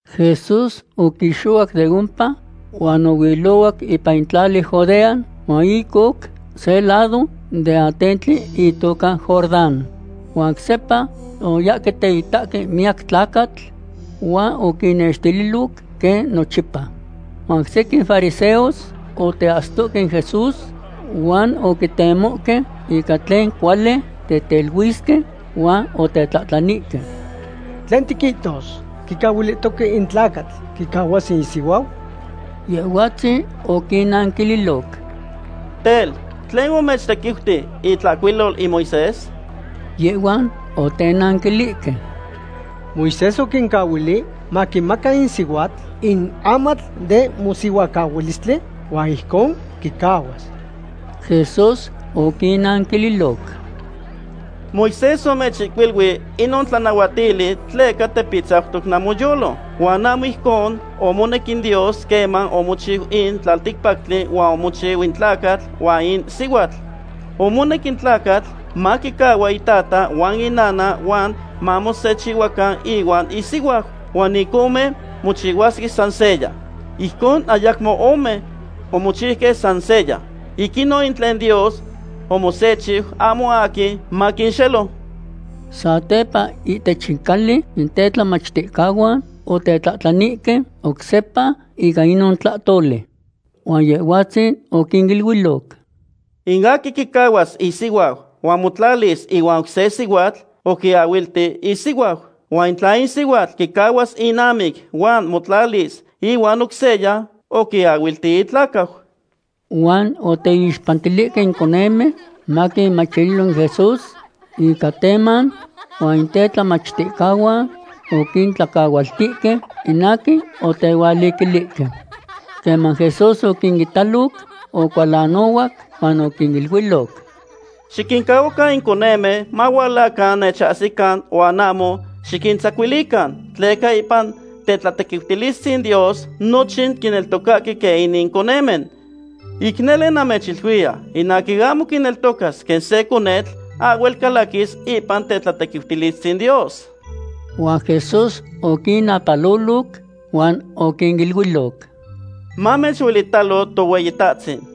Jesús oquixohuac de ompa huan ohuilohuac ipan in tlali Judea huan ic oc se lado den atentli itoca Jordán. Huan oc sepa oyahque teitahque miyac tlacatl, huan oquinnextililoc quen nochipa. Huan sequin fariseos oteahsitohque in Jesús, huan oquitemohque ica tlen cuali teteluisque, huan otetlahtlanihque: ―¿Tlen tiquihtos; quicahuilihtoque in tlacatl quicahuas isihuau? Yehhuatzin oquinnanquililoc: ―Tel, ¿tlen omechtequiuti itlahcuilol in Moisés? Yehhuan otenanquilihque: ―Moisés oquincahuili maquimaca in sihuatl in amatl den mosihuacahualistli huan ijcon quicahuas. Jesús oquinnanquililoc: ―Moisés omechihcuilui inon tlanahuatili tleca tepitzautoc namoyolo. Huan ahmo ijcon omonec in Dios queman omochiu in tlalticpactli huan omochiu in tlacatl huan in sihuatl. Omonec in tlacatl maquicahua itata huan inana huan mamosechihua ihuan isihuau. Huan in ome mochihuasque san seya. Ijcon ayacmo ome, omochiuque san seya. Ic inon in tlen Dios omosechiu, ahmo aquin maquinxelo. Satepa ihtech in cali in tetlamachticahuan otetlahtlanihque oc sepa ica inon tlahtoli. Huan Yehhuatzin oquiniluiloc: ―In aquin quicahuas isihuau huan motlalis ihuan oc se sihuatl, oquiahuilti isihuau. Huan tla in sihuatl quicahuas inamic huan motlalis ihuan oc seya, oquiahuilti itlacau. Huan oteixpantilihque in conemen maquinmachililo in Jesús ica teman, huan in tetlamachticahuan oquintlacahualtihque in aquin otehualiquilihque. Queman Jesús oquinitaloc, ocualanohuac huan oquiniluiloc: ―Xiquincahuacan in conemen mahualacan nechahsican huan ahmo xiquintzacuilican, tleca ipan tetlatequiutilistzin Dios nochin quineltocahque quen inin conemen. Ic nele namechiluiya, in aquin ahmo quineltocas quen se conetl ahhuel calaquis ipan tetlatequiutilistzin Dios. Huan Jesús oquinnapaloloc huan oquiniluiloc: ―Mamechuelitalo Tohueyitahtzin.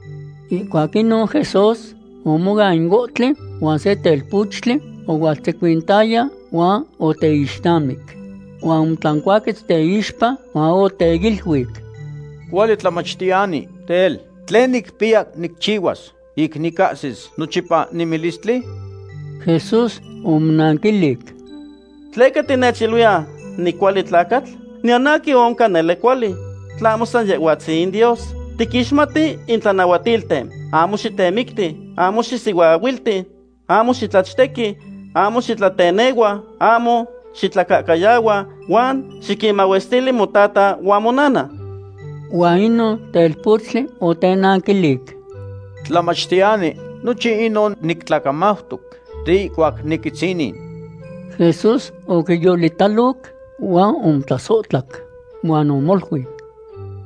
Ihcuac inon Jesús omoan in ohtli, huan se telpochtli ohualtzecuintaya huan oteixnamic. Huan omotlancuaquetz teixpa, huan oteiluic: ―Cuali tlamachtiyani, tel, ¿tlen nicpiya nicchihuas ic nicahsis nochipa nemilistli? Jesús omonanquilic: ―¿Tleca tinechiluiya nicuali tlacatl? Niyan aquin oncan nele cuali, tlahmo san Yehhuatzin in Dios. Tiquixmati in tlanahuatilten: “Ahmo xitemicti, ahmo xisihuaahuilti, ahmo xitlachtequi, ahmo xitlatenehua, ahmo xitlacahcayahua, huan xiquinmahuestili motata huan monana.” Huan inon telpochtli otenanquilic: ―Tlamachtiyani, nochin inon nictlacamautoc de ihcuac niquitzinin. Jesús oquiyolitaloc huan omotlasohtlac. Huan omoluic: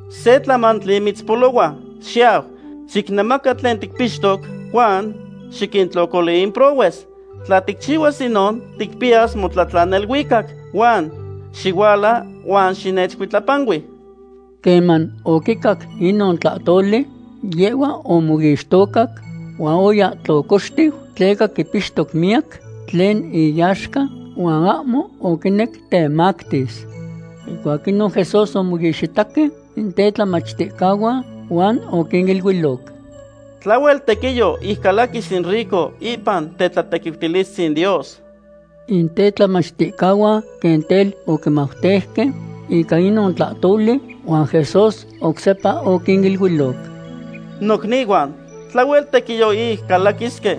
―Se tlamantli mitzpolohua. Xiyau, xicnemaca tlen ticpixtoc huan xiquintlocoli in prohues. Tla ticchihuas inon ticpiyas motlatlan neluicac. Huan xihuala huan xinechcuitlapanui. Queman oquicac inon tlahtoli, yehhua omoixtocac, huan oya tlocoxtiu tleca quipixtoc miyac tlen iyaxca huan ahmo oquinec temactis. Ihcuac inon Jesús omoixitaque in tetlamachticahuan huan oquiniluiloc: ―Tlahuel tequiyo ic calaquis in rico ipan tetlatequiutilistzin Dios. In tetlamachticahuan quen tel oquimauteuque ica inon tlahtoli, huan Jesús oc sepa oquiniluiloc: ―Nocnihuan, tlahuel tequiyo ic calaquisque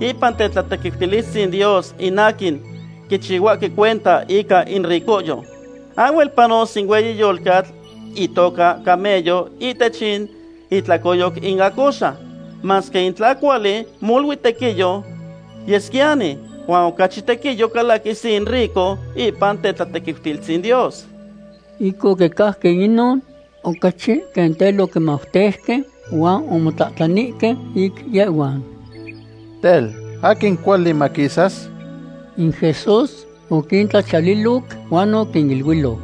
ipan tetlatequiutilistzin Dios in aquin quichihuahque cuenta ica in ricohyo. Ahhuel panos in hueyi yolcatl itoca camello ihtech in itlacoyoc in acoxa. Masque in tla cuali, molui tequiyo yesquiyani. Huan ocachi tequiyo calaquis in rico ipan tetlatequiutilistzin Dios. Ic oquicajque inon, ocachi quen tel quimauteuque huan omotlahtlanihque ic yehhuan: ―Tel, ¿aquin cuali maquisas? In Jesús oquintlachiyaliloc huan oquiniluiloc: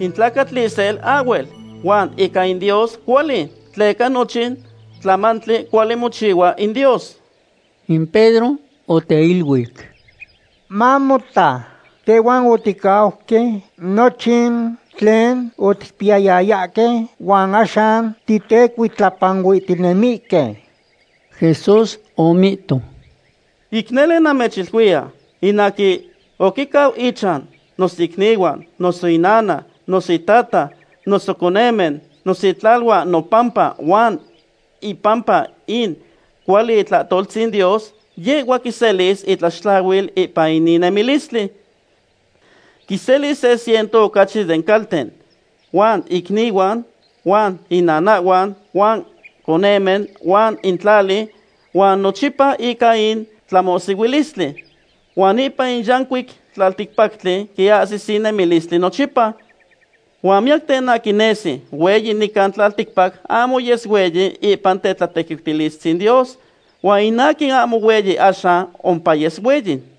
―In tlacatl isel ahhuel, huan ica in Dios cuali, tleca nochin tlamantli cuali mochihua in Dios. In Pedro oteiluic: ―Mamota, tehhuan oticauque nochin tlen oticpiyayahque huan axan titecuitlapanuihtinemihque. Jesús omihto: ―Ic nele namechiluiya, in aquin oquicau ichan, noso icnihuan, noso inana, noso itata, noso conemen, noso itlaluan nopampa huan ipampa in cuali itlahtoltzin Dios, yehhua quiselis itlaxtlahuil ipan inin nemilistli. Quiselis se ciento ocachi den calten, huan icnihuan, huan inanahhuan, huan conemen, huan in tlali, huan nochipa ica in tlamohsihuilistli. Huan ipan in yancuic tlalticpactli quiahsis in nemilistli nochipa. Huan miyacten aquin nesi hueyi nican tlalticpac ahmo yes hueyi ipan tetlatequiutilistzin Dios. Huan in aquin ahmo hueyi axan ompayes hueyi.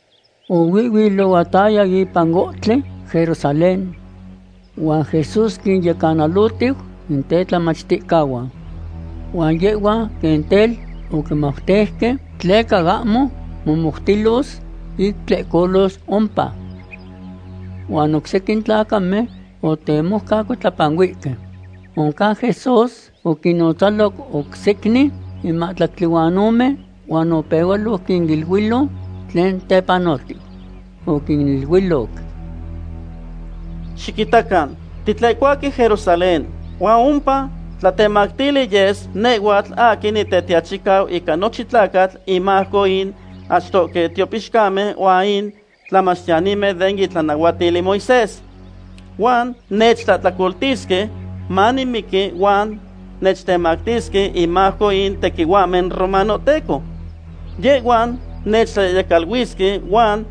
Ohuihhuilohuataya ipan ohtli Jerusalén, huan Jesús quinyecanalotiu in tetlamachticahuan. Huan yehhuan quen tel oquimauteuque tleca ahmo momoutilos ic tlehcolos ompa. Huan in oc sequin tlacamen otemoucacuitlapanuihque. Oncan Jesús oquinnotzaloc oc secnin in mahtlactli huan ome huan opehualoc quiniluiloc tlen tepanotiu. Oquiniluiloc: ―Xiquitacan, titlehcohuahque Jerusalén, huan ompa tlatemactili yes nehhuatl aquin Nitetiachicau ica nochin tlacatl inmajco in achtohque tiopixcamen huan in tlamachtiyanimen den itlanahuatil in Moisés. Huan nechtlahtlacoltisque manimiqui huan nechtemactisque inmajco in tequihuahmen romanohteco. Yehhuan nechtlayehyecaluisque, huan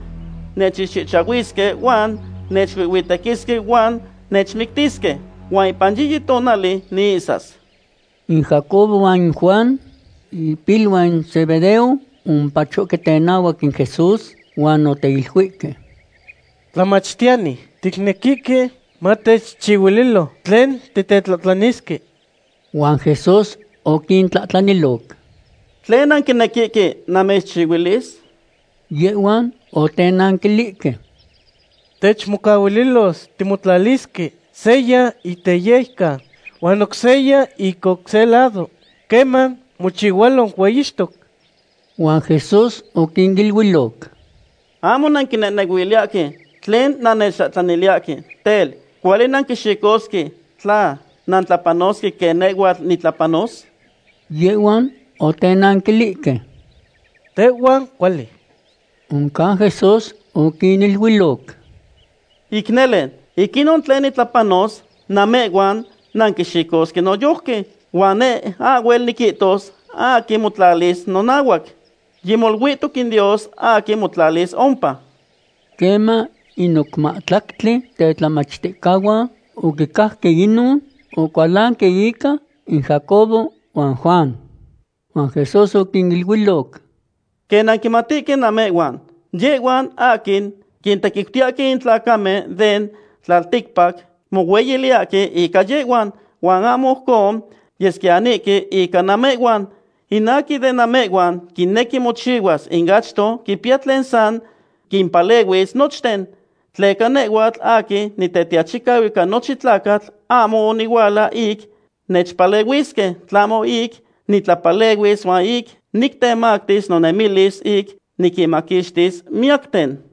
nechixchihchahuisque, huan nechuihhuitequisque huan nechmictisque. Huan ipan yiyi tonali niihsas. In Jacobo huan in Juan, ipiluan in Zebedeo, omopachohque tenahuac in Jesús huan oteiluihque: ―Tlamachtiyani, ticnequihque matechchihuililo tlen titetlahtlanisque. Huan Jesús oquintlahtlaniloc: ―¿Tlen nanquinequihque namechchihuilis? Yehhuan otenanquilihque: ―Techcahuililos timotlalisque seya ic teyejcan huan oc seya ic oc se lado queman mochihualo hueyixtoc. Huan Jesús oquiniluiloc: ―Ahmo nanquinehnehuiliyahque tlen nannechtlahtlaniliyahque. Tel, ¿cuali nanquixicosque tla nantlapanosque quen nehhuatl nitlapanos? Yehhuan otenanquilihque: ―Tehhuan cuali. Oncan Jesús oquiniluiloc: ―Ic nele, ic inon tlen nitlapanos, namehhuan nanquixicosque noyojqui. Huan neh ahhuel niquihtos aquin motlalis nonahuac. Yimoluihtoc in Dios aquin motlalis ompa. Queman in oc mahtlactli tetlamachticahuan oquicajque inon, ocualanque ica in Jacobo huan Juan. Huan Jesús oquiniluiloc: ―Quen nanquimatihque namehhuan, yehhuan aquin quintequiutiyahque in tlacamen den tlalticpac mohueyiliyahque ica yehhuan. Huan ahmo ojcon yesquiyanihque ica namehhuan. In aquin de namehhuan quinequi mochihuas in achto quipiya tlen san quimpalehuis nochten. Tleca nehhuatl aquin Nitetiachicau ica nochin tlacatl ahmo onihuala ic nechpalehuisque, tlahmo ic nitlapalehuis huan ic nictemactis nonemilis ic niquinmaquixtis miyacten.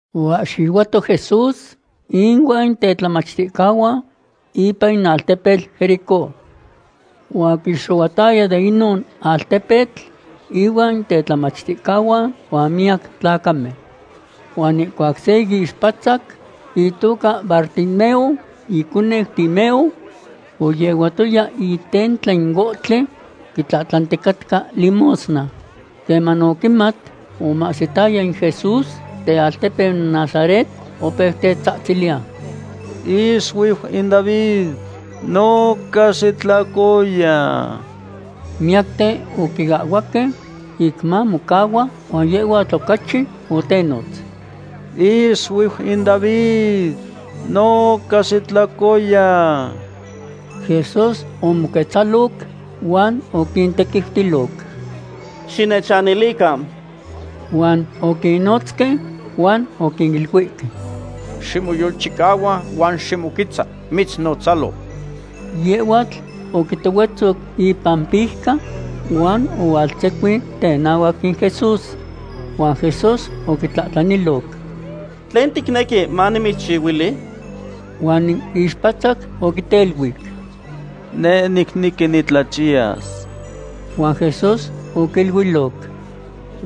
Oahxihuato Jesús inuan in tetlamachticahuan ipan in altepetl Jericó. Huan oquixohuataya de inon altepetl inuan in tetlamachticahuan huan miyac tlacamen. Huan ihcuac se ixpatzac itoca Bartimeo iconeu Timeo oyehuatoya itentla in ohtli, quitlahtlanticatca limosna. Queman oquimat omahsitaya in Jesús tealtepeu Nazaret, opeu tetzatziliya: ―¡Ixuiu in David, noca xitlocoya! Miyacten oquiahhuaque ic mamocahua, huan yehhuatl ocachi otenotz: ―¡Ixuiu in David, noca xitlocoya! Jesús omoquetzaloc huan oquintequiutiloc: ―Xinechanilican. Huan oquinotzque huan oquiluihque: ―Ximoyolchicahua huan ximoquetza. Mitznotzalo. Yehhuatl oquitohuetzoc ipampijca huan ohualtzecuin tenahuac in Jesús. Huan Jesús oquitlahtlaniloc: ―¿Tlen ticnequi manimitzchihuili? Huan in ixpatzac oquiteluic: ―Neh nicnequi nitlachiyas. Huan Jesús oquiluiloc: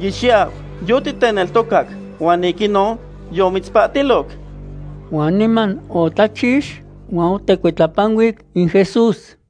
―Yixiyau, yotiteneltocac huan ic inon yomitzpahtiloc. Huan niman otlachix, huan otecuitlapanuic in Jesús.